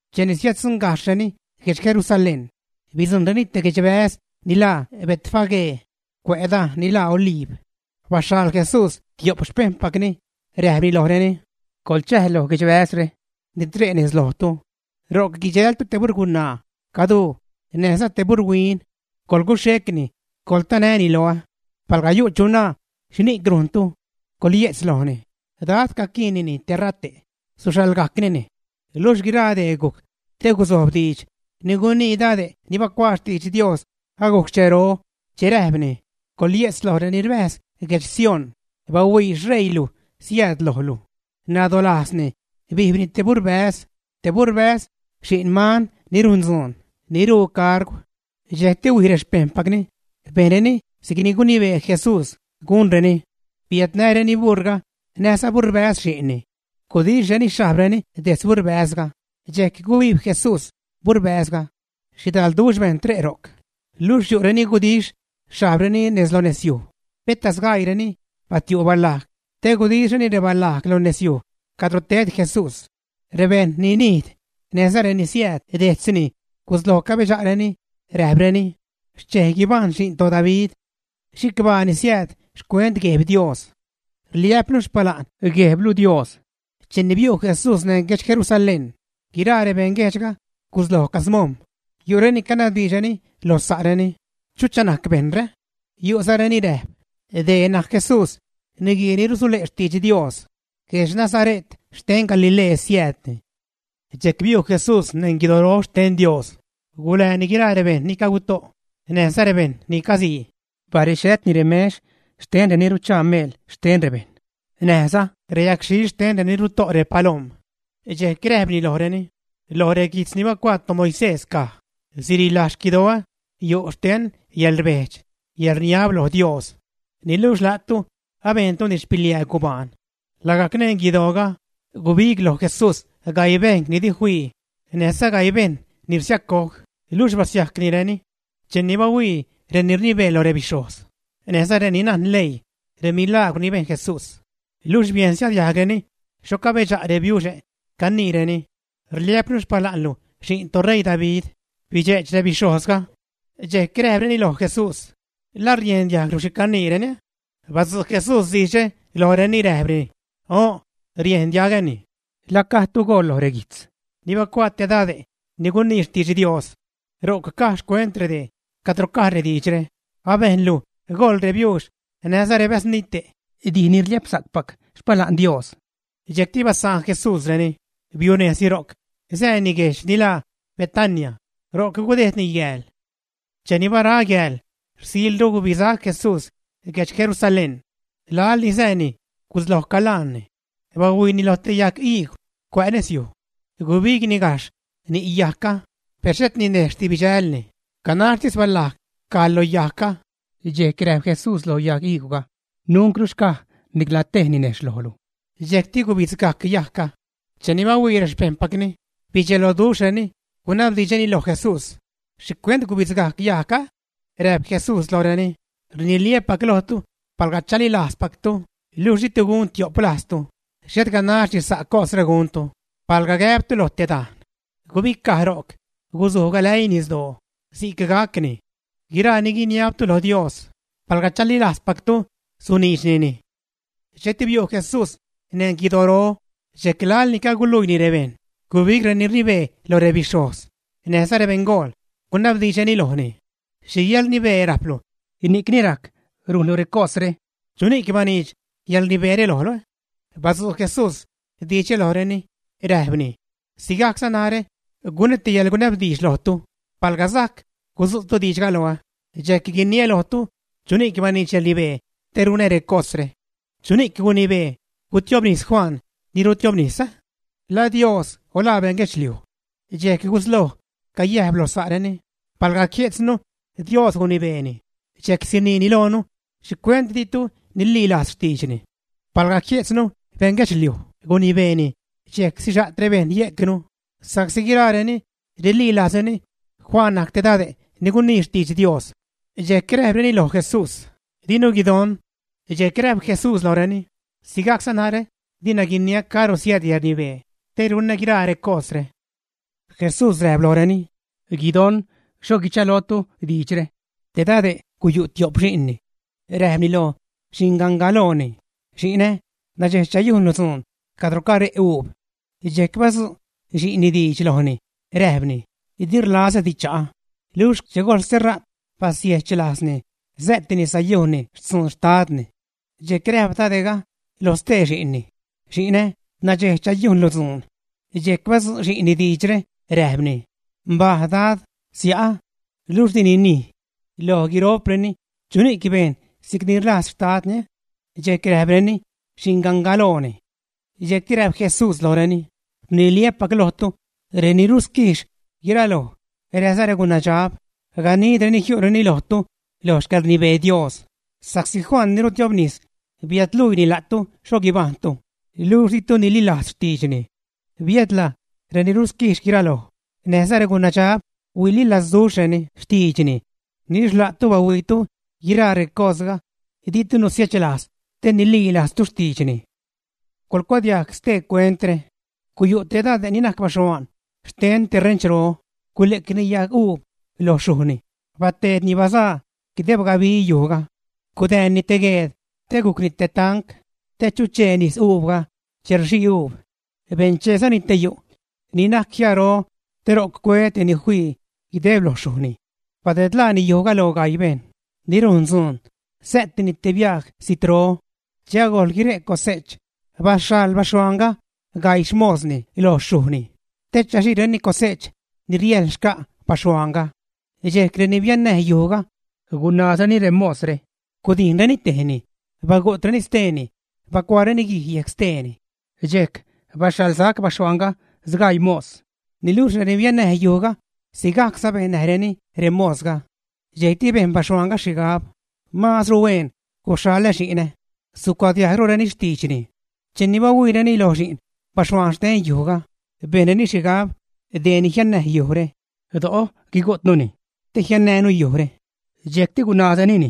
Cheni Siäddzuṉgajxhreni guedx Jerusalén, bidzujṉreni te guedxbäz ni laa Betfagé, cuä' dajn ni laa Oliib. Baxhaḻ Jesús tio'p xpejṉpacni, räjpni lojreni: ―Coḻchäj loj guedxbäzre ni tre' nez lojtu. Ro'c guidxältu te buṟgunaa caduu näjza tebuṟhuin. Coḻguxhecni, coḻtanäni loä. Palga yu' chu naa: “¿Xhini'c rujntu?”, coḻye'tz lojni: “Dad caquiinnini terate'. Suxhaḻgajcnini.” Luxh guiraa dee gujc te guzojb diidx ni gunii dade' nani bacuaa xtidx Dios agujc xchero, che räjpni: Coḻye'tz loj reni rbäjz guedx Sión, bahuii xṟeiilu siääd lojlu, nadolajzni bijbni te buṟbäz, te buṟbäz, xi'n man ni rujn dzuun, ni ruu cargw. Dxejcti huij rexpejṉpacni, bejnreni si'c gunibee Jesús gunreni. Biädnäreni buṟga näjza buṟbäz xi'nni. Gudixhreni xhajbreni detz buṟbäzga, dxejc gubijb Jesús buṟbäzga. Xhidalduxh bejṉ tre' ro'c, luxh yu' reni gudixh xhajbreni lo nez yuj, peta sgaiireni batiu' balajg te gudixhreni rebalajg lo nez yuj cadro ted Jesús. Rebejṉ ni nijd, näjza reni siääd dejtzni gusloj cabedxa'reni, räjpreni: ―¡Xchej guibajṉ Xi'n toDavid! ¡Chicbaa ni siääd xcuent Gueb Dios! Rliä'pnu xpala'n Guejblu Dios. Cheni biu' Jesús neṉ guedx Jerusalén, guiraa rebeṉ guejdxga gusloj camojm̲, yu'reni canabdiidxreni loj sa'reni: ―¿Chucha najc bejṉre? Yu'zareni räjp: ―Dee najc Jesús, niguii ni rusule' xtidx Dios. Guedx Nazare't xten Galilee siäädni. Dxejc biu' Jesús neṉ guidoro xten Dios, gulääni guiraa rebejṉ ni caguto' näjza rebejṉ ni casii. Barexhätni remex xten reni ruchaa meel xten rebejṉ, näjza reyagxhil xten reni ruto' repalom. Dxejc räjpni lojreni: ―Loj reguijtz ni bacuaa rebeṉgaloo caj: “Sirilaj xquidoä yu' xten yäḻrbejdx, yäḻrniab loj Dios.” Niluxh la'tu abejntuni xpiliää gubaan. Lagajc neṉ guidooga, gubig loj Jesús gaii bejṉ ni di fii näjza gaii bejṉ ni rsiacoj, luxh basiajcnireni. Cheni bahuii reni rnibee loj rebixhojz, näjza reni najn leii remilagwr ni bejn Jesús, luxh biejnza diajgreni xho cabedxa' rebiuxe' caniireni: “Rliä'pnu xpala'nlu Xi'n toṟeii David”, bidxe'ch rebixhojzga. Dxejc räjpreni loj Jesús: ―¿La riejn diajglu xhi caniireni, ä? Badzu' Jesús diidxre lojreni räjpni: ―O'n, riejn diagäni. ¿La gadtu goḻ lo reguijtz ni bacuaa te dade' ni gunii xtidx Dios? Ro'c caj xcuent redee, cadro caj rediidxre: Abejnlu goḻ rebiuux näjza rebäznite' dij ni rliäpsa'cpac xpala'n Dios. Dxejcti basaan Jesúsreni, biunejzni ro'c sääni guedxe' ni laa Betania, ro'c gudejdni yääl. Cheni bara yääl, rsilru gubisac Jesús guedx Jerusalén. Laḻ ni sääni, gusloj calaanni. Bahuiini loj te yag iigw cuä' nezyuj. Gubigni gajxh ni' yajgga, per xhet ninejxhdi bidxälni, ganaxhtis balajg caj lo yajgga. Dxejc räjp Jesús lo yajg iigwga: ―¡Nuncru xcaj nicla tej ninejxh lojlu! Dxejcti gubidzgajc yajgga. Cheni bahuii rexpejṉpacni, bidxeloduxhreni, gunabdiidxreni loj Jesús: ―¿Xhi cuent gubidzgajc yajgga? Räjp Jesús lojreni: ―Rniliä́pac lojtu, palga chalilajzpactu, luxh ditu gun tio'p lajztu, xhet ganaxdi sa' cosre guntu, palga gäbtu lo te dajn: “Gubicaj ro'c, gusuj galäii nisdoo”, si'c gacni. Guiraa ni guiniabtu loj Dios, palga chalilajzpactu, suniidxnini. Dxejcti biu' Jesús neṉ guidoro, dxejc laḻ ni caguluiini rebejṉ gubig reni rnibee loj rebixhojz näjza rebeṉgool, gunabdiidxreni lojni: ―¿Xhi yäḻrnibee rajplu ni'cni rajc rujnlu recosre? ¿Chuni'c baniidx yäḻrnibeere lojlu? Badzu' Jesús diidxre lojreni räjpni: ―Sigajcza narä gunä te yäḻgunabdiidx lojtu; palga sajc gudzu'tu diidxga loä, dxejc guiniä lojtu chuni'c baniidx yäḻrnibee te runä recosre. ¿Chuni'c gunibee gutiobnis Juan ni rutiobnis? ¿La Dios o la beṉ guedxliuj? Dxejc gusloj cayäjp lo sa'reni, palga jie'tznu Dios gunibeeni, dxejc sinajni loonu, ¿xhicuent ditu nililajz xtiidxni? Palga jie'tznu bejṉ guedxliuj gunibeeni, dxejc sixa't rebejṉ yejcnu sa'csi guiraareni rililajzreni Juan najc te Dade' ni gunii xtidx Dios. Dxejc räjpreni loj Jesús: ―Dinu guidon. Dxejc räjp Jesús lojreni: ―Sigajcza narä dina guiniä caro siääd yäḻrnibee te runä guiraa recosre. Jesús räjp lojreni: ―Guidon xho guichalootu diidxre. Te dade' guyu' tio'p xi'nni. Räjpni loj xingangalojni: “Xi'nä, nadxej chayujnlu dzuun cadro care' uub.” Dxejc badzu' xi'nni diidx lojni, räjpni: “Di rlazädi cha'a.” Luxh che gojl ste ra't, basiejch lajzni säätini sayujnni xtzun xtadni. Dxejc räjp dade'ga lo stee xi'nni: “Xi'nä, nadxej chayujnlu dzuun.” Dxejc badzu' xi'nni diidxre, räjpni: “Mbaj, dad, sia'ä.” Luxh dini nij. Loj guiro'preni, ¿chuni'c bejn si'cni rlajz xtadni? Dxejc räjpreni: ―Xingangalooni. Dxejcti räjp Jesús lojreni: ―Rniliä́pac lojtu, reni ruquijx guiraloj, näjza regunabdxab ganidreni jiu'reni lojtu loj xcäḻrnibee Dios, sa'csi Juan ni rutiobnis biädluiini la'tu xho guibajṉtu, luxh ditu nililajz xtiidxni. Biädla reni ruquijx guiraloj, näjza regunadxab huililazduxhreni xtiidxni. Niluxh la'tu bahuiitu guiraa recosga, ditu nusiechlajz te nililajztu xtiidxni. ’¡Coḻcuadiajg stee cuentre! Guyu' te dade' ni najc baxhuaan xten te renchro, gule'cni yaguub loj xyujni, bateedni bazaa guideb gabi yujga. Gudäänni te gueed te gujcni te tanc te chuchee nisuubga che rxii reuub. Bencheezani te yu' ni najc jiaaro te ro'c cue te ni fii guideb loj xyujni. Badedlaani yujga loj gaii bejṉ ni rujn dzuun, sä'tini te biaj zijtro. Che agojl guire' cose'ch baxhaḻ baxhuaanga gaii xmosni loj xyujni te chaxiireni cose'ch ni riäjl xca' baxhuaanga. Dxejc reni biannäj yujga gunaazreni remosre, gudijnreni tejni, bagu'treni steeni, bacuaareni guij yejc steeni. Dxejc baxhaḻsac baxhuaanga sgaii mos. Niluxh reni biannäj yujga sigajcza bennäjreni remosga. ’Dxejcti bejn baxhuaanga xhigab: “Maazru huen guxhaḻä xi'nä; sucuadiajgrureni xtiidxni.” Cheni bahuiireni lo xi'n baxhuaan xten yujga, bejnreni xhigab: “Deeni jiannäj yujre; do'o guigu'tnuni te jiannäänu yujre.” Dxejcti gunaazrenini,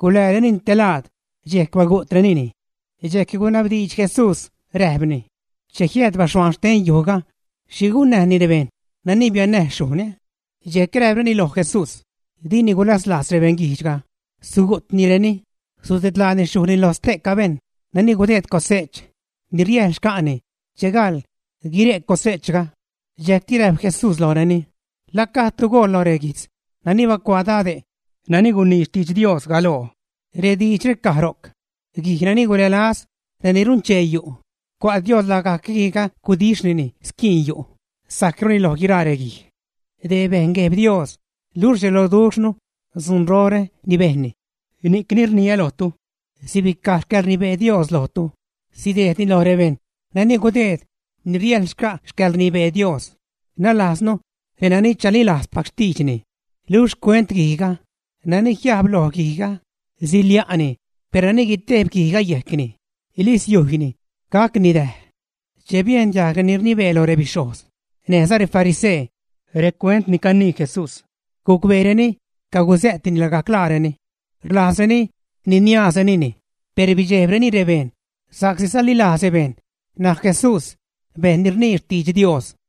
guläärenini te laad, dxejc bagu'trenini. Dxejc gunabdiidx Jesús räjpni: ―Che jiääd baxhuaan xten yujga, ¿xhi gunnäjni rebejṉ nani biannäj xyujni? Dxejc räjpreni loj Jesús: ―Dini gulazlajz rebeṉguijdxga, sugu'tnireni, sudedlaani xyujni loj ste'ca bejṉ nani gudeed cose'ch ni riäjl xca'ni che gaḻ guire' cose'chga. Dxejcti räjp Jesús lojreni: ―¿La gajdtu goḻ lo reguijtz nani bacuaa dade' nani gunii xtidx Dios galoo? Rediidxre caj ro'c: Guij nani gulälaz reni runchee yu', cua' Dios lagajc guijga gudixhnini squiin yu', sajcruni loj guiraa reguij. Dee bejn Gueb Dios, luxh rdxeloduxhnu dzunrore ni bejnni. ’Ni'cni rniä lojtu, sibicaj xcäḻrnibee Dios lojtu, sidejdni loj rebejṉ nani gudeed ni riäjl xca' xcäḻrnibee Dios, nalajznu renani chalilajzpac xtiidxni. Luxh xcuent guijga: nani jiajb lo guijga, silia'ni, per nani guitejb guijga yejcni, li siujyni, gacni däj. Che biejn diajg reni rnibee lo rebixhojz näjza refarisee recuent ni canii Jesús, gucbeereni cagusä'tni lagajc laareni. Rlajzreni niniaazrenini, per bidxejbreni rebejṉ sa'csi salilajz rebejṉ najc Jesús bejṉ ni rnii xtidx Dios.